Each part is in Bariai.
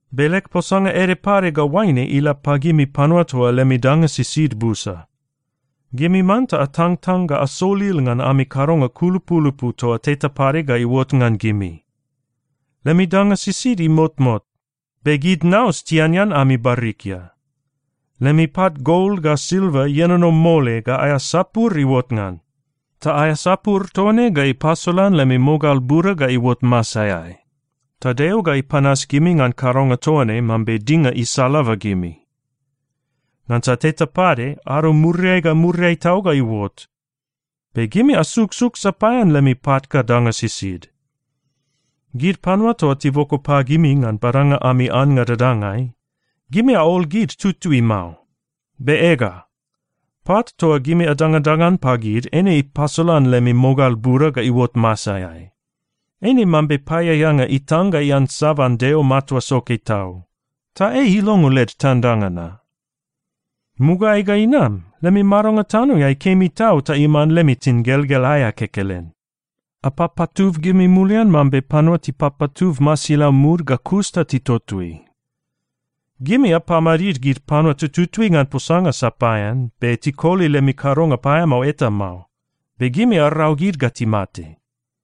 Be leg posanga ede pade ga oaine ila pagimi panua toa lemi danga sisid busa. Gimi manta atangtang ga asolil ngan ami kadonga kulupulupu toa teta pade ga iuot ngan gimi! Lemi danga sisid imotmot be gid naus tianean ami barikia. Lemi pat gol ga silva ienono mole ga aea sapur iuot ngan, ta aea sapur toa ne ga ipasolan lemi mogal buda ga iuot masaeai. Ta Deo ga ipanas gimi ngan kadonga toa ne mambe dinga isalaba gimi. Ngansa teta pade ado muriai ga muriai tau ga iuot, be gimi asuksuk sapaean lemi pat ga danga sisid. Gid panua toa tiboko pagimi ngan badanga ami annga dadangai, gimi aol gid tutui mao. Be ega, pat toa gimi adangadangan pagid eine ipasolan lemi mogal buda ga iuot masaeai. Eine mambe paeaeanga titang ga tiansaban Maron Deo Matua Soke Tau. Ta ei ilongo led tandanga na. Mugaeai ga inam, lemi madonga tanoeai kemi tau ta iman lemi tingelgel aea kekelen. Apapatub gimi mulian mambe panua tipapatub masilau mud, ga kus ta titotoi. Gimi apamadid gid panua tututui ngan posanga sapaean, be tikoli lemi kadonga paeamao eta mao. Be gimi arau gid ga timate.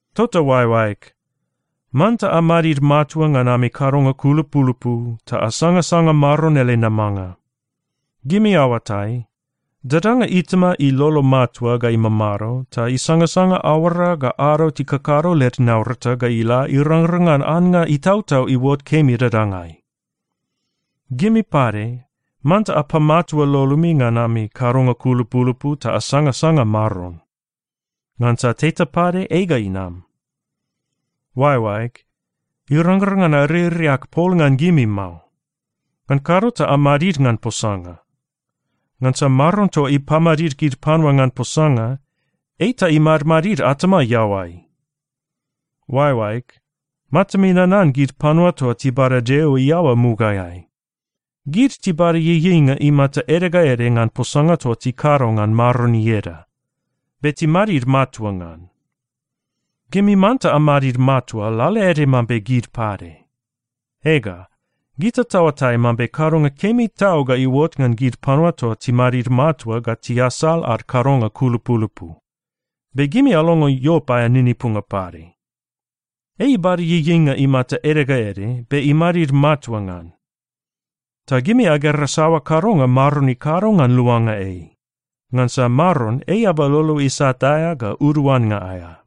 Tota oaeoaeg, manta amadid matua ngan ami kadonga kulupulupu ta asangasanga Maron ele namanga. Gimi aoatai, dadanga itama ilolo matua ga imamado ta isangasanga aoara ga ado tikakado led naurata ga ila irangrang ngan annga itautau iuot kemi dadangai. Gimi pade manta apamatua lolomi ngan ami kadonga kulupulupu ta asangasanga Maron. Ngansa teta pade ei ga inam. Oaeoaeg, irangrang ngan aririak pol ngan gimi mao. Ngan kado ta amadid ngan posanga. Ngansa Maron toa ipamadid gid panua ngan posanga, ei ta imadmadid atama iaoai! Oaeoaeg, matami nanan gid panua toa tibada Deo iaoa mugaeai. Gid tibada ieieinga imata ede ga ede ngan posanga toa tikado ngan Maron ieda, be timadid matua ngan. Gimi manta amadid matua lalaede mambe gid pade. Ega, gita taoatai mambe kadonga kemi tau ga iuot ngan gid panua toa timadid matua ga tiasal ad kadonga kulupulupu. Be gimi alongo Iop aea ninipunga pade. Ei ibada ieieinga imata ede ga ede, be imadid matua ngan. Ta gimi agera saoa kadonga Maron ikado ngan luanga ei. Ngansa Maron ei eaba lolo isat aea ga uduannga aea.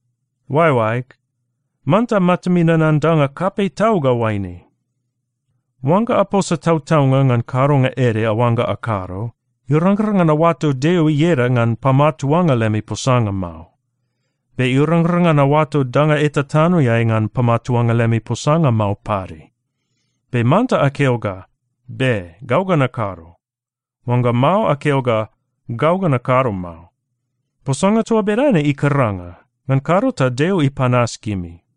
Oaeoaeg, manta matami nanan danga kapei tau ga oaine: Oangga aposa tautaunga ngan kadonga ede aoangga akado, irangrang ngan aoato Deo ieda ngan pamatuanga lemi posanga mao. Be irangrang ngan aoato danga eta tanoeai ngan pamatuanga lemi posanga mao pade. Be manta akeo ga, “Be. Gau ga nakado.” Oangga mao, akeo ga, “Gau ga nakado mao.” Posanga toa bedane ikaranga. Ngan kado ta Deo ipanas gimi.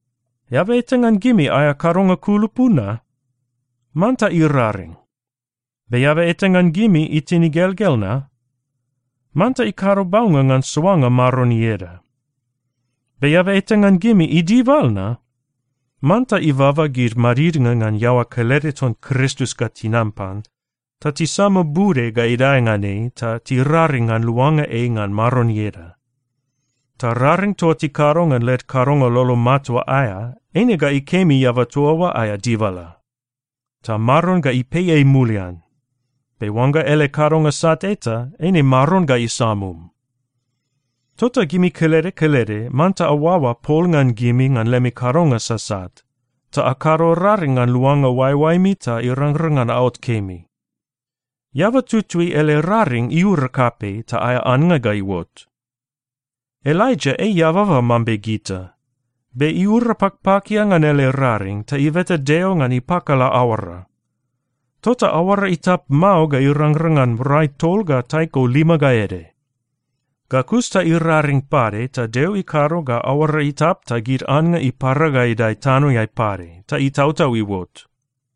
Eaba eta ngan gimi aea kadonga kulupu na? Manta iraring. Be eaba eta ngan gimi itin igelgel na? Manta ikado baunga ngan soanga Maron ieda. Be eaba eta ngan gimi idibal na? Manta ibaba gid madidnga ngan iaoa kelede ton Kristus ga tinam pan ta tisama bude ga idae ngan ei ta tiraring ngan luanga ei ngan Maron ieda. Ta raring toa tikado ngan led kadonga lolo matua aea, eine ga ikemi eaba toa oa aea dibala. Ta Maron ga ipei ei mulian. Be oangga ele kadonga sat eta, eine Maron ga isamum. Tota gimi kelede kelede manta aoaoa pol ngan gimi ngan lemi kadonga sasat. Ta akado raring ngan luanga oaeoaemi ta irangrang ngan aot kemi. Eaba tutui ele raring iura kapei, ta aea annga ga iuot. Elaija ei eababa mambe gita. Be iura pakpakia ngan ele raring ta ibeta Deo ngan ipakala aoara. Tota aoara itap mao ga irangrang ngan rai tol ga taiko lima ga ede. Ga kus ta iraring pade ta Deo ikado ga aoara itap ta gid annga ipara ga idae tanoeai pade ta itautau iuot.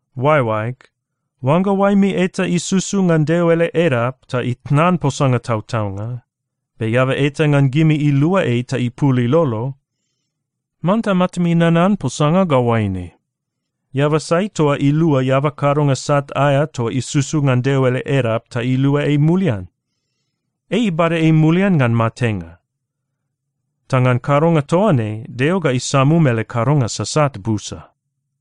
Oaeoaeg, oangga oaemi eta isusu ngan Deo ele edap ta itnan posanga tautaunga, be eaba eta ngan gimi ilua ei ta ipul ilolo, manta matami nanan posanga ga oaine: Eaba sai toa ilua eaba kadonga sat aea toa isusu ngan Deo ele edap ta iluai mulian, ei ibada ei mulian ngan matenga. Ta ngan kadonga toa ne, Deo ga isamum ele kadonga sasat busa.